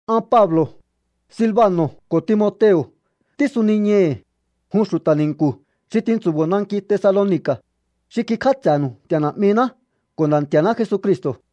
An Pablo̱, Silbano̱ ko̱ Timoteo̱ tísuniñai̱hi̱, jun xu̱ta̱ ni̱nku̱ xi tintsu̱bo̱o nanki Tesaloni̱ka̱, xi kikj'áts'e̱nu̱u Nti̱a̱ Na̱'miná ko̱ Nda̱ Nti̱a̱ná Jesucristo̱.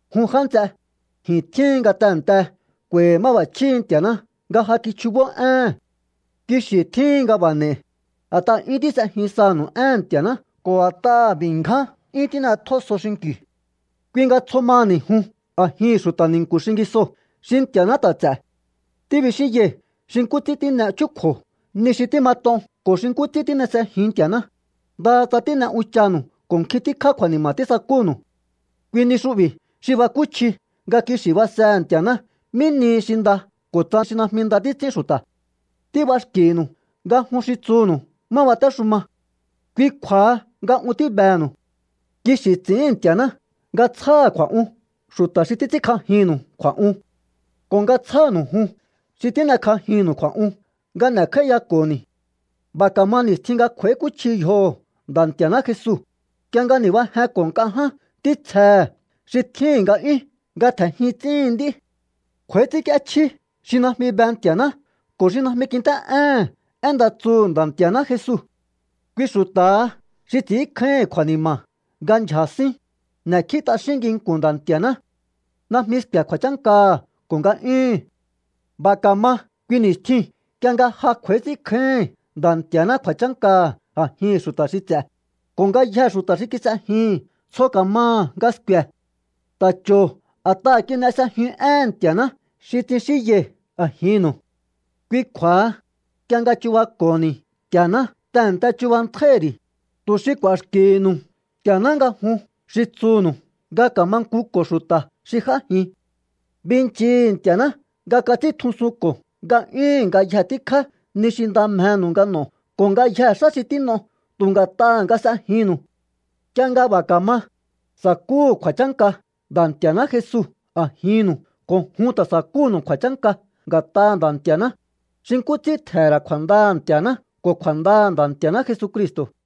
Jun já nts'e, ji̱n tjíhin nga tehe̱nte k'u̱a̱i̱hi̱ máb'a̱chjíhi̱ Nti̱a̱ná nga ja kichjubó éhe̱n. Kixi̱ tjíhin nga b'a̱ n'e̱i̱, a̱t'aha̱ 'yún tís'ejin sanu̱u éhe̱n Nti̱a̱ná ko̱ a̱t'aha̱ b'i̱ ngján 'yún tín'etjó so xinki̱u. Kui nga tsjo maha̱ni̱ jun a̱jihi̱n xu̱ta̱ ni̱nku̱ xingisoo̱ xi Nti̱a̱ná ta̱ ts'e̱. Tíbixínyai̱ xi nkú ts'ín tín'e chúkju̱o ni xi tímat'on ko̱ xi nkú ts'ín tín'e s'ejiun Nti̱a̱ná, ndaha tsa tín'e unchanu̱u ko̱ nkjin tíkjá kju̱a̱ni̱ma̱ tísakúnu̱u. Kui ni xu'bi̱ xi bakúchji nga kixi̱ basehe̱ Nti̱a̱ná mí nihi xi nda ko̱ tsa xi najmi nda títs'ín xu̱ta̱. Tíb'axki̱nu̱u nga jun xi tsuhu̱nu̱u má batéxuma. Kui kju̱a̱ha nga un tíbehe̱nu̱u. Kixi̱ ts'i̱ín Nti̱a̱ná nga tsjáha̱ kju̱a̱'un xu̱ta̱ xi títs'ínkj'ajinnu̱u kju̱a̱'un ko̱ nga tsjánu̱u jun xi tín'ekj'ajinnu̱u kju̱a̱'un nga n'e̱kj'áíyako̱ni̱. B'a̱ ka̱ma ni̱stjin nga kj'u̱a̱íkúchji yjoho̱ Nda̱ Nti̱a̱ná Jesu, nk'ie nga ni̱bajenko̱ nk'a ján ntítsjehe̱ xi tjíhi̱n nga'yún nga tje̱njin ts'íhin nd'í. Kj'u̱a̱í ts'ínk'íéchjí xi najmi be Nti̱a̱ná ko̱ xi najmi kint'é'éhe̱n én nda tsuhu̱ Nda̱ Nti̱a̱ná Jesu. Kui xu̱ta̱ha xi ts'i̱ínkjáíhi̱n kju̱a̱ni̱ma̱ nga ndyja̱ sín. N'e̱kjí t'axín nginku̱n Nda̱ Nti̱a̱ná. Najmi sku̱e̱ kju̱a̱chánkaha̱ ko̱ nga'yúhu̱n. B'a̱ ka̱ma kui ni̱stjiu̱n nk'ie nga ja kj'u̱a̱í ts'ínkjáíhi̱n Nda̱ Nti̱a̱ná kju̱a̱chánkaha̱ a̱jihi̱n xu̱ta̱ xi ts'e̱, ko̱ ngayjee̱ xu̱ta̱ xi kis'ejihi̱n tsjo ka̱maha̱ nga sku̱e̱. Ta̱ cho̱o a̱t'aha̱ kin'e s'ejiun éhe̱n Nti̱a̱ná xi tsixínyai̱ a̱jinnu̱u. Kui kju̱a̱ha, nk'ie nga chubako̱ho̱ni̱ Nti̱a̱ná tehe̱nte chubantjáíhi̱ ri̱, tu̱ xi k'u̱a̱xki̱hi̱nu̱u Nti̱a̱ná nga jun xi tsuhu̱nu̱u nga ka̱mankuko̱o xu̱ta̱ xi j'ájin. Binchii̱hi̱ Nti̱a̱ná nga kats'íntjusunko̱ nga'yúhu̱n ngayje tíkjá ni xi nda mjenu̱u nga n'o̱o ko̱ ngayjee̱ xá xi tín'o tu̱ nga̱t'aha̱ nga s'ejinnu̱u. Nk'ie nga b'a̱ ka̱ma, sa̱kúhu̱ kju̱a̱chánka Nda̱ Nti̱a̱ná Jesu a̱jinnu̱u ko̱ jun ta̱ sa̱kúnu̱u kju̱a̱chánka nga̱t'aha̱ Nda̱ Nti̱a̱ná, xi nkú ts'ín tje̱he̱n ra̱ kju̱a̱ndaha̱ Nti̱a̱ná ko̱ kju̱a̱ndaha̱ Nda̱ Nti̱a̱ná Jesucristo̱.